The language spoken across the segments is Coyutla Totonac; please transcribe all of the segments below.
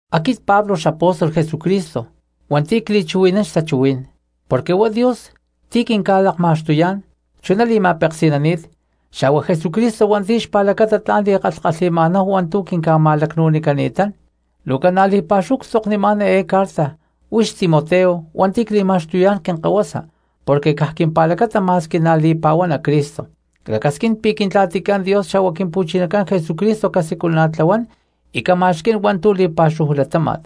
Aquit Pablo xapóstol Jesucristo hua̠nti̠ cli̠chuhui̠nán xtachuhuí̠n, porque huá Dios ti̠ quinca̠lakma̠xtuyá̠n chuná li̠ma̠peksi̠nani̠t xa̠hua Jesucristo hua̠nti̠ xpa̠lacata tla̠n li̠kalhkalhi̠ma̠náhu hua̠ntu̠ quinca̠ma̠lacnu̠nicani̠tán. Luu ca̠na li̠pa̠xúhu ctzoknimá̠n eé carta huix Timoteo hua̠nti̠ cli̠ma̠xtuyá̠n quinkahuasa porque caj quimpa̠lacata ma̠squi na̠ li̠pa̠huana Cristo; clacasquín pi̠ Quintla̠ticán Dios xa̠hua Quimpu̠chinacán Jesucristo casiculana̠tlahuán y cama̠xquí̠n hua̠ntu̠ li̠pa̠xúhu latáma̠t.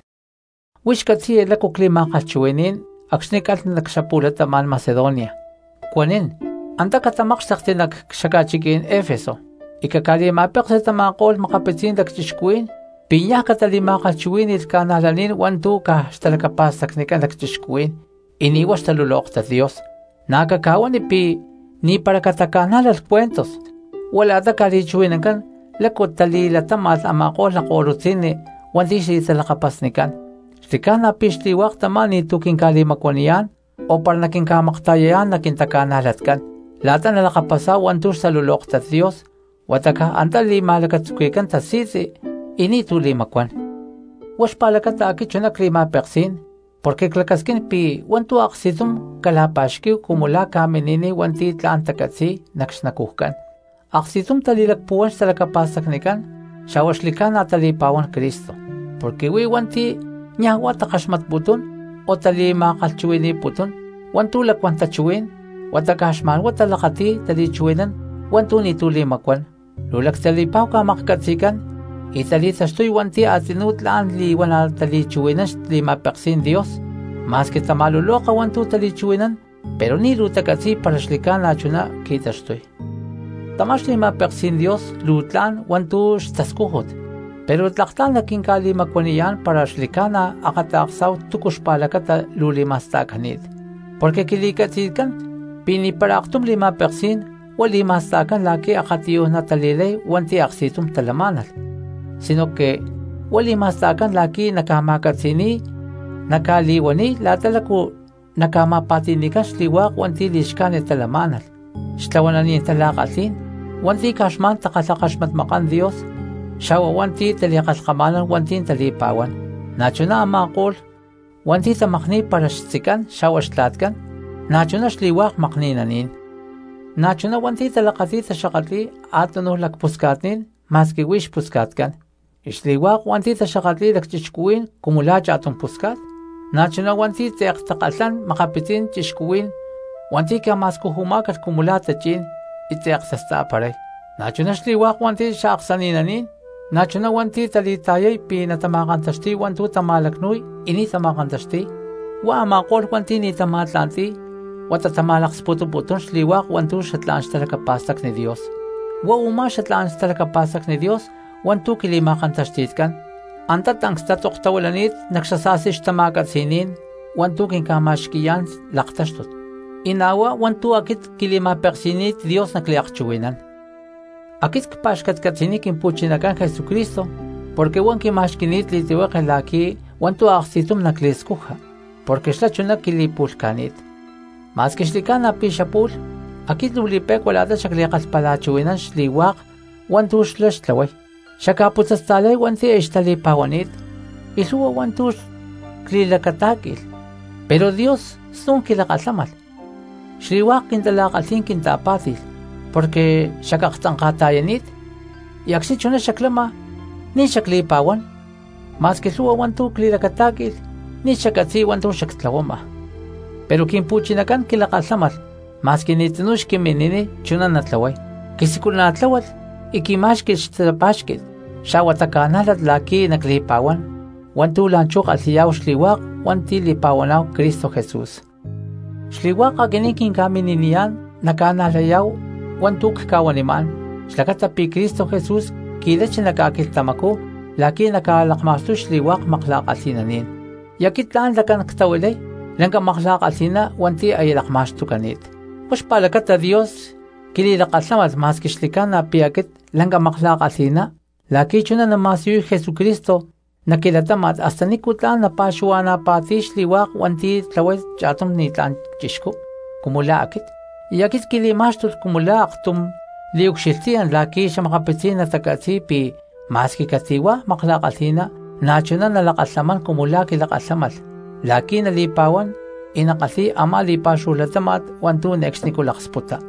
Huix catzi̠ya lácu cli̠ma̠kalhchuhui̠ní̠n acxni̠ calh nac xapu̠latama̠n Macedonia, cuanín: “Antá catamákxtekti nac xaca̠chiquí̠n Efeso y caca̠li̠ma̠peksi tama̠ko̠lh makapitzí̠n lacchixcuhuí̠n pi̠ niaj catali̠ma̠kalhchuhuí̠ni̠lh cristianos hua̠ntu̠ caj xtalacapa̠stacnicán lacchixcuhuí̠n y ni̠ huá xtalulóktat Dios. Na̠ caca̠huani pi̠ ni̠para cataca̠nájlalh cuentos huá la̠ta ca̠li̠chuhui̠nancán lácu tali̠latáma̠lh a̠ma̠ko̠lh lakko̠lutzi̠nni hua̠nti̠ xli̠talakapasnicán. Xli̠ca̠na pi̠ xli̠hua̠k tamá ni̠tu̠cu quinca̠li̠macuaniyá̠n o para naquinca̠makta̠yayá̠n nac quintaca̠najlatcán la̠ta nalakapasá̠hu hua̠ntu̠ xtalulóktat Dios, huata caj antá li̠ma̠lacatzuqui̠cán tasi̠tzi y ni̠tu̠ li̠macuán.” Huá xpa̠lacata aquit chuná cli̠ma̠peksí̠n porque clacasquín pi̠ hua̠ntu̠ aksti̠tum cala̠pa̠xquí̠hu cumu la̠ ca̠mini̠niy hua̠nti̠ tla̠n tacatzi̠y nac xnacujcán, aksti̠tum tali̠lacpuhuán xtalacapa̠stacnicán xa̠hua xli̠ca̠na tali̠pa̠huán Cristo. Porque huí hua̠nti̠ niaj huá takaxmatputún o tali̠ma̠kalhchuhui̠ni̠putún hua̠ntu̠ lacuán tachuhuí̠n huata caj xma̠nhuá talakati̠y tali̠chuhui̠nán hua̠ntu̠ ni̠tu̠ li̠macuán. Luu lactali̠pa̠hu ca̠maklhcatzi̠cán y tali̠taxtuy hua̠nti̠ a̠tzinú tla̠n li̠huana̠ tali̠chuhui̠nán xli̠ma̠peksí̠n Dios, ma̠squi tama̠luloka hua̠ntu̠ tali̠chuhui̠nán pero ni̠ luu tacatzi̠y para xli̠ca̠na chuná qui̠taxtuy. Tamá xli̠ma̠peksí̠n Dios luu tla̠n hua̠ntu̠ xtascújut pero tlak tla̠n naquinca̠li̠macuaniyá̠n para xli̠ca̠na akata̠ksá̠hu túcu xpa̠lacata luu li̠ma̠sta̠cani̠t. Porque quili̠catzi̠tcán pi̠ ni̠para aktum li̠ma̠peksí̠n huá li̠ma̠sta̠cán la̠qui̠ akatiyuj natali̠lay hua̠nti̠ aksti̠tum talamá̠nalh sinoque huá li̠ma̠sta̠cán la̠qui̠ naca̠ma̠catzi̠ni̠y naca̠li̠huaniy la̠ta lácu naca̠ma̠pa̠ti̠ni̠cán xli̠hua̠k hua̠nti̠ li̠xcájnit talamá̠nalh, xtlahuananí̠n tala̠kalhí̠n, hua̠nti̠ caj xma̠n takalhakaxmatmakán Dios xa̠hua hua̠nti̠ tali̠kalhkama̠nán hua̠nti̠ tali̠pa̠huán, na̠chuná a̠ma̠ko̠lh hua̠nti̠ tamakni̠y para xtzicán xa̠hua xtla̠tcán, na̠chuná xli̠hua̠k makni̠naní̠n. Na̠chuná hua̠nti̠ talakati̠y taxakatli̠y a̠túnuj lacpusca̠tní̠n ma̠squi huí xpusca̠tcán, y xli̠hua̠k hua̠nti̠ taxakatli̠y lacchixcuhuí̠n cumu la̠ cha̠tum pusca̠t. Na̠chuná hua̠nti̠ tze̠k takalhán makapitzí̠n cristianos hua̠nti̠ ca̠ma̠scujumá̠calh cumu la̠ tachí̠n y tze̠k tasta̠paray, na̠chuná xli̠hua̠k hua̠nti̠ xaaksani̠naní̠n, na̠chuná hua̠nti̠ tali̠ta̠yay pi̠ natama̠kantaxti̠y hua̠ntu̠ tama̠lacnu̠y y ni̠ tama̠kantaxti̠y; huá a̠ma̠ko̠lh hua̠nti̠ ni̠ tama̠tla̠nti̠y huata tama̠laksputuputún xli̠hua̠k hua̠ntu̠ xatlá̠n xtalacapa̠stacni Dios. Huá u̠má xatlá̠n xtalacapa̠stacni Dios hua̠ntu̠ quili̠ma̠kantaxti̠tcán antá tancs tatzoktahuilani̠t nac xasa̠sti xtama̠catzi̠ní̠n hua̠ntu̠ quinca̠ma̠xqui̠yá̠n laktáxtut, y na̠ huá hua̠ntu̠ aquit quili̠ma̠peksi̠ni̠t Dios nacliakchuhui̠nán. Aquit cpa̠xcatcatzi̠niy Quimpu̠chinacán Jesucristo porque huá quima̠xqui̠ni̠t li̠tlihueke la̠qui̠ hua̠ntu̠ aksti̠tum nacli̠scuja porque xlá chuná quili̠pu̠lhca̠ni̠t; ma̠squi xli̠ca̠na pi̠ xapu̠lh aquit luu li̠pe̠cua la̠ta xacli̠kalhpalachuhui̠nán xli̠hua̠k hua̠ntu̠ xlá xtlahuay, xacca̠putzasta̠lay hua̠nti̠ aya xtali̠pa̠huani̠t y lhu̠hua hua̠ntu̠ cli̠lacatá̠qui̠lh. Pero Dios snu̠n quilakalhámalh, xli̠hua̠k quintala̠kalhí̠n quinta̠pá̠ti̠lh porque xacaktzanka̠ta̠yani̠t y acxni̠ chuná xaclama ni̠ xacli̠pa̠huán, ma̠squi lhu̠hua hua̠ntu̠ cli̠lacatá̠qui̠lh ni̠ xaccatzi̠y hua̠ntu̠ xactlahuama. Pero Quimpu̠chinacán quilakalhámalh ma̠squi ni̠ tzinú xquimini̠niy chuná natlahuay, quisiculana̠tláhualh y quimá̠xqui̠lh xtapá̠xqui̠t xa̠hua taca̠nájlat la̠qui̠ nacli̠pa̠huán hua̠ntu̠ la̠nchú kalhi̠yá̠hu xli̠hua̠k hua̠nti̠ li̠pa̠huaná̠hu Cristo Jesús. Xli̠hua̠k aquinín quinca̠mini̠niyá̠n naca̠najlayá̠hu hua̠ntu̠ cca̠huanimá̠n xlacata pi̠ Cristo Jesús qui̠lachi nac ca̠quilhtamacú la̠qui̠ naca̠lakma̠xtuy xli̠hua̠k makla̠kalhi̠naní̠n, y aquit tla̠n lacán ctahuilay lanca makla̠kalhi̠ná hua̠nti̠ aya lakma̠xtucani̠t. Huá xpa̠lacata Dios quili̠lakalhámalh ma̠squi xli̠ca̠na pi̠ aquit lanca makla̠kalhi̠ná la̠qui̠ chuná nama̠siyuy Jesucristo nac quilatáma̠t hasta nícu tla̠n napa̠xuhua̠na̠pa̠ti̠niy xli̠hua̠k hua̠ntu̠ tlahuay cha̠tum ni̠tlá̠n cristiano cumu la̠ aquit, y aquit quili̠má̠xtulh cumu la̠ aktum liucxilhtiyán la̠qui̠ xa̠makapitzí̠n natacatzi̠y pi̠ ma̠squi cati̠hua̠ makla̠kalhi̠ná na̠ chuná nalakalhamán cumu la̠ quilakalhámalh la̠qui̠ nali̠pa̠huán y nakalhi̠y a̠má li̠pa̠xúhu latáma̠t hua̠ntu̠ ne̠cxnicú nalaksputa.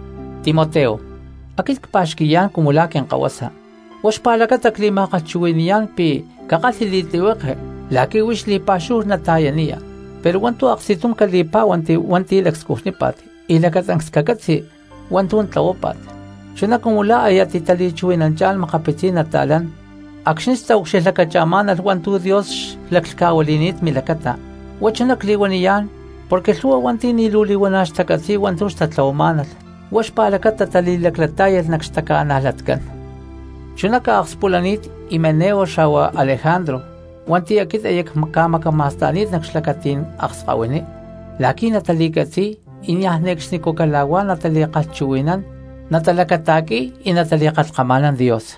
Timoteo, aquit cpa̠xqui̠yá̠n cumu la̠ quinkahuasa, huá xpa̠lacata cli̠ma̠kalhchuhui̠ni̠yá̠n pi̠ cakalhi li̠tlihueke la̠qui̠ huix li̠pa̠xúhu nata̠yaniya, pero hua̠ntu̠ aksti̠tum cali̠pá̠huanti hua̠nti̠ lacscujnípa̠t y lacatancs cacatzi hua̠ntu̠ tlahuápa̠t, chuná cumu la̠ aya titali̠chuhui̠nanchá̠n makapitzí̠n nata̠lán acxni̠ xtaucxilhlacacha̠má̠nalh hua̠ntu̠ Dios xlaclhca̠huili̠ni̠t milacata. Huá chuná cli̠huaniyá̠n porque lhu̠hua hua̠nti̠ ni̠ luu li̠huana̠ xtacatzi̠y hua̠ntu̠ xtatlahuamá̠nalh, huá xpa̠lacata tali̠laclatá̠yalh nac xtaca̠najlatcán. Chuná ca̠akspulani̠t Himeneo xa̠hua Alejandro hua̠nti̠ aquit aya cca̠macama̠sta̠ni̠t nac xlacatí̠n akskahuiní la̠qui̠ nata̠li̠catzi̠y y niaj ne̠cxnicú cala̠huá natali̠kalhchuhui̠nán y niaj ne̠cxnicú natalacata̠qui̠y nali̠kalhkama̠nán Dios.